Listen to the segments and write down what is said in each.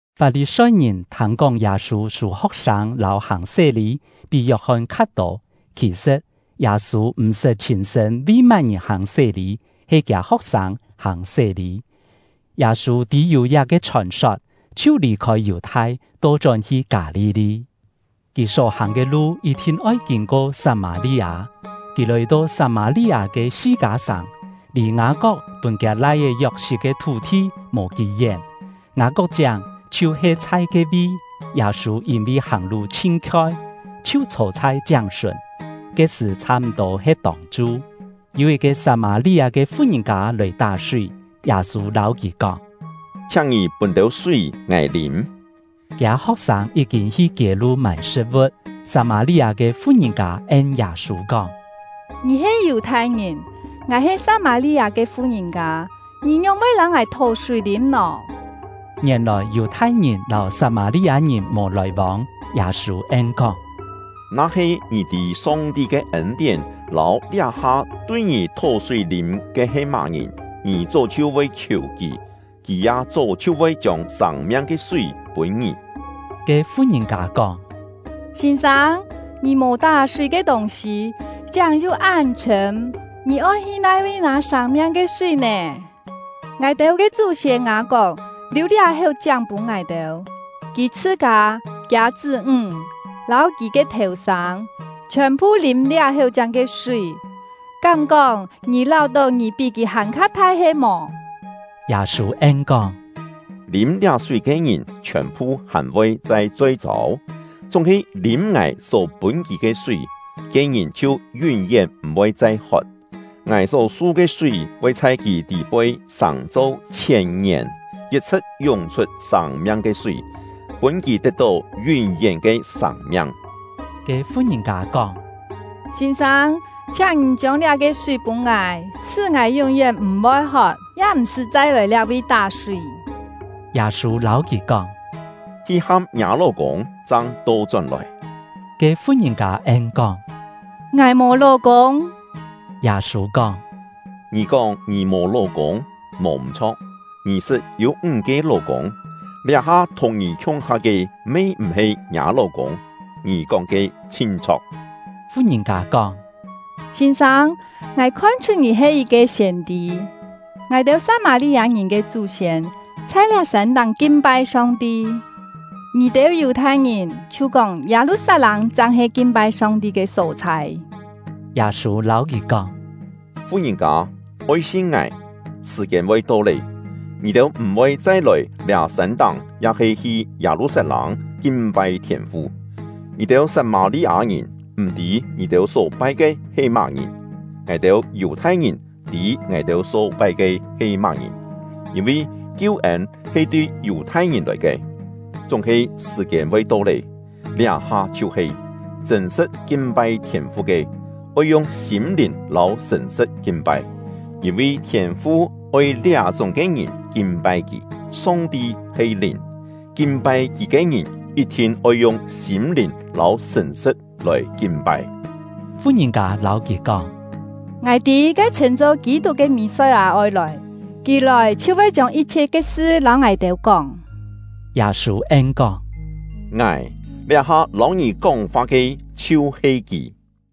Fap-li-soi-ngìn thâng-kóng Yâ-sû sû ho̍k-sâng lâu hàng sé-lî pí Yok-hon kha tô. (Khì-sṳ̍t, Yâ-sû m̀-sṳt chhîn-sṳ̂n vi má-ngìn hàng sé-lî, he kiâ ho̍k-sâng hàng sé-lî.) Yâ-sû tî yû liá-ke chhòn-sot, chhiu lì-khôi Yù-thai, to-chón hi Kâ-li-li; kì só-hàng ke lu yit-thin oi kîn-ko Sat-mâ-li-â. Kì lòi-to Sat-mâ-li-â ke Si-kâ sàng, lì Ngâ-kok pûn kiâ lai-é Yok-sit ke thú-thi mò kí-yén; Ngâ-kok-chiáng chhiu-he chhai ke-vi. Yâ-sû yîn-vi hàng-lu chhin khioi, chhiu chhô chhai chiáng-sùn; ke-sṳ̀ chhâ-m̀-tô he tông-chu. Yû yit-ke Sat-mâ-li-â ke fu-ngìn-kâ lòi tá-súi; Yâ-sû lâu kì kóng: “Chhiáng ngì pûn têu súi ngài lîm.” (Kiâ ho̍k-sâng yí-kîn hi kiê-lu mâi sṳ̍t-vu̍t.) Sat-mâ-li-â ke fu-ngìn-kâ en Yâ-sû kóng: “Ngì he Yù-thai-ngìn, ngài he Sat-mâ-li-â ke fu-ngìn-kâ, ngì ngióng-voi lâu ngài thó-súi lîm nò?” (Ngièn-lòi Yù-thai-ngìn lâu Sat-mâ-li-â-ngìn mò lòi-vông.) Yâ-sû en-kóng: “Na-he ngì tî Song-ti ke ên-tién lâu liá-ha tui ngì thó-súi lîm ke he má-ngìn, ngì chó chhiu voi khiù kì, kì ya chó chhiu voi chiông sâng-miang ke súi pûn ngì.” Ke fu-ngìn-kâ kóng: “Sîn-sâng, ngì mò tá-súi ke tûng-sî, chiáng yu án chhṳ̂m, ngì oi hi nai-vi nâ sâng-miang ke súi nè? Ngài-têu ke chú-siên Ngâ-kok liù liá-héu chiáng pûn ngài-têu; kì chhṳ-kâ, kiâ chṳ́-ńg, lâu kì ke thèu-sâng chhiòn-phu lîm liá-héu chiáng ke súi; kám-kóng ngì láu-tó ngì pí kì hàn-kha thai he-mò?” Yâ-sû en-kóng: “Lîm liá súi ke ngìn chhiòn-phu hàn voi chai choi-châu; chúng-he lîm ngài só pûn kì ke súi, ke ngìn chhiu yún-yén m̀-voi chai hot. Ngài só su ke súi voi chhai kì tî-poi sàng-cho chhièn-ngièn, yit-chhṳ̍t yúng-chhut sâng-miang ke súi, pûn kì tet-tó yún-yén ke sâng-miang.” Ke fu-ngìn-kâ kóng: “Sîn-sâng, chhiáng ngì chiông liá-ke súi pûn ngài, sṳ́ ngài yún-yén m̀-voi hot, ya m̀-sṳ́ chai lòi liá-vi tá-súi.” Yâ-sû lâu kì kóng: “Hi ham ngiâ ló-kûng, chang to-chón-lòi.” Ke fu-ngìn-kâ en-kóng: “Ngài mò ló-kûng.” Yâ-sû kóng: “Ngì kóng ngì mò ló-kûng, mò m̀-chho̍k. Ngì sṳt yû ńg-ke ló-kûng, liá-ha thùng ngì khiung-ha ke me m̀-he ngiâ ló-kûng. Ngì kóng ke chhin chho̍k.” Fu-ngìn-kâ kóng: “Sîn-sâng, ngài khon-chhut ngì he yit-ke siên-tî. Ngài-têu Sat-mâ-li-â-ngìn ke chú-siên chhai liá sân-táng kin-pai Song-ti, ngì-têu Yù-thai-ngìn chhiu kóng Yâ-lu-sat-lâng chang he kin-pai Song-ti ke só-chhai.” Yâ-sû lâu kì kóng: “Fu-ngìn-kâ, oi sin ngài! Sṳ̀-kiên voi to lé, ngì-têu m̀-voi chai lòi liá sân-táng ya-he hi Yâ-lu-sat-lâng kin-pai Thiên-fu. Ngì-têu Sat-mâ-li-â-ngìn m̀-tî ngì-têu só pai ke he má-ngìn, ngài-têu Yù-thai-ngìn tî ngài-têu só pai ke he má-ngìn, yîn-vi kiu-ên he tui Yù-thai-ngìn lòi ke. Chúng-he sṳ̀-kiên voi to lé, liá-ha chhiu-he, chṳ̂n-sṳ̍t kin-pai Thiên-fu ke, oi yung sîm-lìn lâu sṳ̀n-sṳ̍t kin-pai, yîn-vi Thiên-fu oi liá-chúng ke ngìn kin-pai Kì. Song-ti he Lìn, kin-pai Kì ke ngìn yit-thin oi yung sîm-lìn lâu sṳ̀n-sṳ̍t lòi kin-pai.” Fu-ngìn-kâ lâu kì kóng: “Ngài tî ke chhṳ̂n-cho Kî-tuk ke Mì-soi-â oi lòi, kì lòi chhiu voi chiông yit-chhiet ke sṳ lâu ngài-têu kóng.” Yâ-sû en-kóng: “Ngài, liá-ha lâu ngì kóng-fa ke, chhiu-he kì!”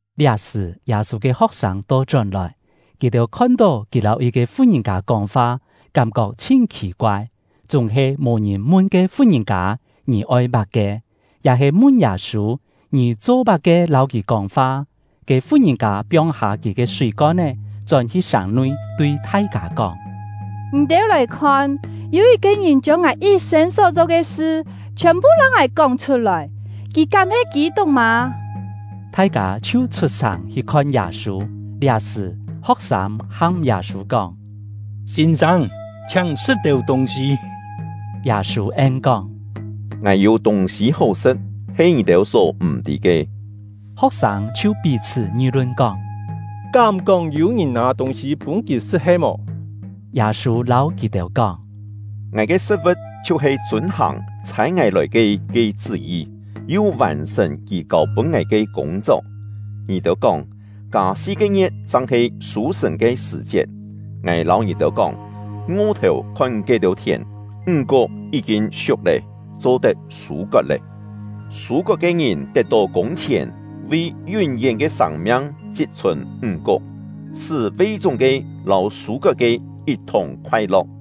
Liá-sṳ̀, Yâ-sû ke ho̍k-sâng to-chón-lòi. Kì-têu khon-tó kì lâu yit-ke fu-ngìn-kâ kóng-fa, kám-kok chhin khì-koai, chúng-he mò ngìn mun ke fu-ngìn-kâ: “Ngì oi má-ke?” ya-he mun Yâ-sû: “Ngì cho-má-ke lâu kì kóng-fa?” Ke fu-ngìn-kâ piong-hâ kì ke súi-kon-é, chón-hi sàng-nui, tui thai-kâ kóng: “Ngì-têu lòi khon! Yû yit-ke ngìn chiông ngài yit-sên só-cho ke sṳ chhiòn-phu lâu ngài kóng chhut-lòi; kì kám he Kî-tuk mâ?” Thai-kâ chhiu chhut-sàng hi khon Yâ-sû. Liá-sṳ̀, ho̍k-sâng ham Yâ-sû kóng: “Sîn-sâng, chhiáng sṳ̍t-têu tûng-sî.” Yâ-sû en-kóng: “Ngài yû tûng-sî hó sṳ̍t, he ngì-têu só m̀-tî ke.” Ho̍k-sâng chhiu pí-chhṳ́ ngi-lun kóng: “Kám-kóng yû-ngìn nâ tûng-sî pûn kì sṳ̍t he-mò?” Yâ-sû lâu kì-têu kóng: “Ngài ke sṳ̍t-vu̍t chhiu-he chûn-hàng ‘Chhâi ngài lòi ke’ ke chṳ́-yi, yu vàn-sṳ̀n Kì kâu-pûn ngài ke kûng-chok. Ngì-têu kóng: ‘Kâ si-ke ngie̍t chang he sû-sṳ̀n ke sṳ̀-chiet.’ Ngài lâu ngì-têu kóng, ngo-thèu khon ke-têu thièn; ńg-kuk yí-kîn siuk lé, cho-tet sû-kot lé! Sû-kot ke ngìn tet-tó kûng-chhièn, vi yún-yén ke sâng-miang chit-chhùn ńg-kuk, sṳ́ ve-chúng-ke lâu sû-kot-ke yit-thùng khoai-lo̍k.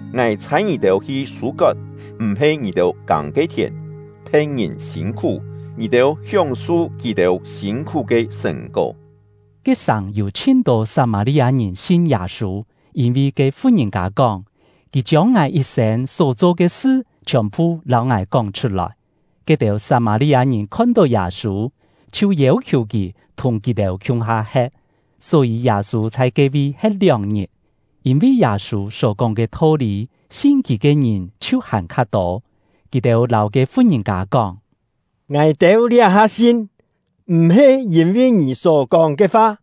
Ngài chhâi ngì-têu hi sû-kot m̀-he ngì-têu kâng ke thièn; phe̍t-ngìn sîn-khú, ngì-têu hióng-su kì-têu sîn-khú ke sṳ̀n-kó.” Ke-sàng yû chhin-tô Sat-mâ-li-â-ngìn sin Yâ-sû, yîn-vi ke fu-ngìn-kâ kóng: “Kì chiông ngài yit-sên só-cho ke sṳ chhiòn-phu lâu ngài kóng chhut-lòi.” Ke-têu Sat-mâ-li-â-ngìn khon-tó Yâ-sû, chhiu yêu-khiù kì thùng kì-têu khiung-ha he̍t; só-yî Yâ-sû chhai ke-vi he̍t lióng-ngit. Yîn-vi Yâ-sû só-kóng ke tho-lî, sin kì ke ngìn chhiu hàn-kha tô. Kì-têu lâu ke fu-ngìn-kâ kóng: “Ngài-têu liá-ha sin, m̀-he yîn-vi ngì só-kóng ke fa,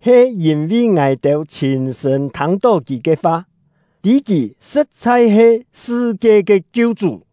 he yîn-vi ngài-têu chhîn-sṳ̂n thâng-tó kì ke fa, tî kì sṳ̍t-chhai he sṳ-kie ke Kiu-chú.”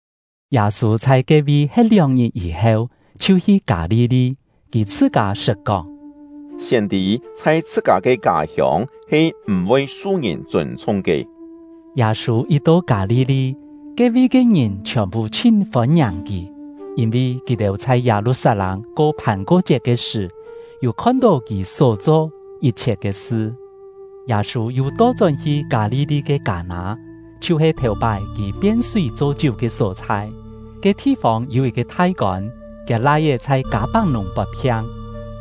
Yâ-sû chhai ke-vi he̍t lióng-ngit yî-heu, chhiu hi Kâ-li-li. Kì chhṳ-kâ sṳt kóng: “Siên-tî chhai chhṳ-kâ ke kâ-hiông he m̀-voi su ngìn chûn-chhung ke.” Yâ-sû yit to Kâ-li-li, ke-vi ke ngìn chhiòn-phu chhin fôn-ngiàng kì; yîn-vi kì-têu chhai Yâ-lu-sat-lâng ko Phàn-ko-chiet ke sṳ̀, yû khon-tó kì só-cho yit-chhiet ke sṳ. Yâ-sû yu to-chón-hi Kâ-li-li ke Kâ-nâ, chhiu-he thèu-pái kì pien súi cho chiú ke só-chhai. Ke thi-fông yû yit-ke thai-kôn, kiâ lai-é chhai Kâ-pak-nùng pot-phiang.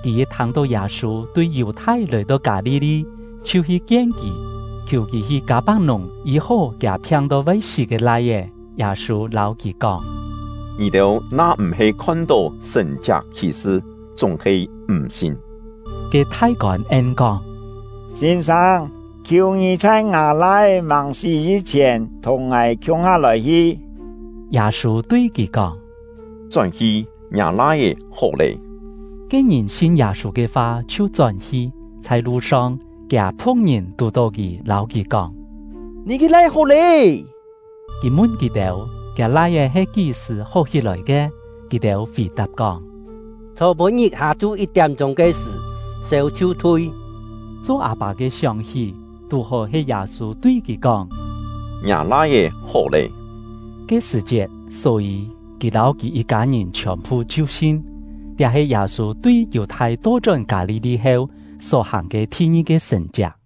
Kì yit thâng-tó Yâ-sû tui Yù-thai lòi-to Kâ-li-li, chhiu hi kien kì, khiù kì hi Kâ-pak-nùng yî-hó kiâ phiang-to voi sí ke lai-é. Yâ-sû lâu kì kóng: “Ngì-têu na-m̀-he khon-tó sṳ̀n-chiak khì-sṳ, chúng-he m̀ sin.” Ke thai-kôn en-kóng: “Sîn-sâng, khiù ngì chhai ngâ lai-é màng sí yî-chhièn thùng ngài khiung-ha lòi-hi.” Yâ-sû tui kì kóng: “Chón-hi, ngiâ lai-é hó lé!” Ke ngìn sin Yâ-sû ke fa chhiu chón-hi. Chhai lu-song, kiâ phu̍k-ngìn tù-tó kì, lâu kì kóng: “Ngì ke lai-é hó lé!” Kì mun kì-têu, kiâ lai-é he kí-sṳ̀ hó hí-lòi ke. Kì-têu fì-tap kóng: “Chhô-pû-ngit hâ-chu yit-tiám-chûng ke sṳ̀, sêu chhiu thui.” Cho â-pâ ke sióng-hí, tú-hó he Yâ-sû tui kì kóng: “Ngiâ lai-é hó lé” ke sṳ̀-chiet. Só-yî, kì lâu kì yit-kâ-ngìn chhiòn-phu chhiu sin. Liá he Yâ-sû tui Yù-thai to-chón Kâ-li-li heu só-hàng ke thi-ngi-ke sṳ̀n-chiak.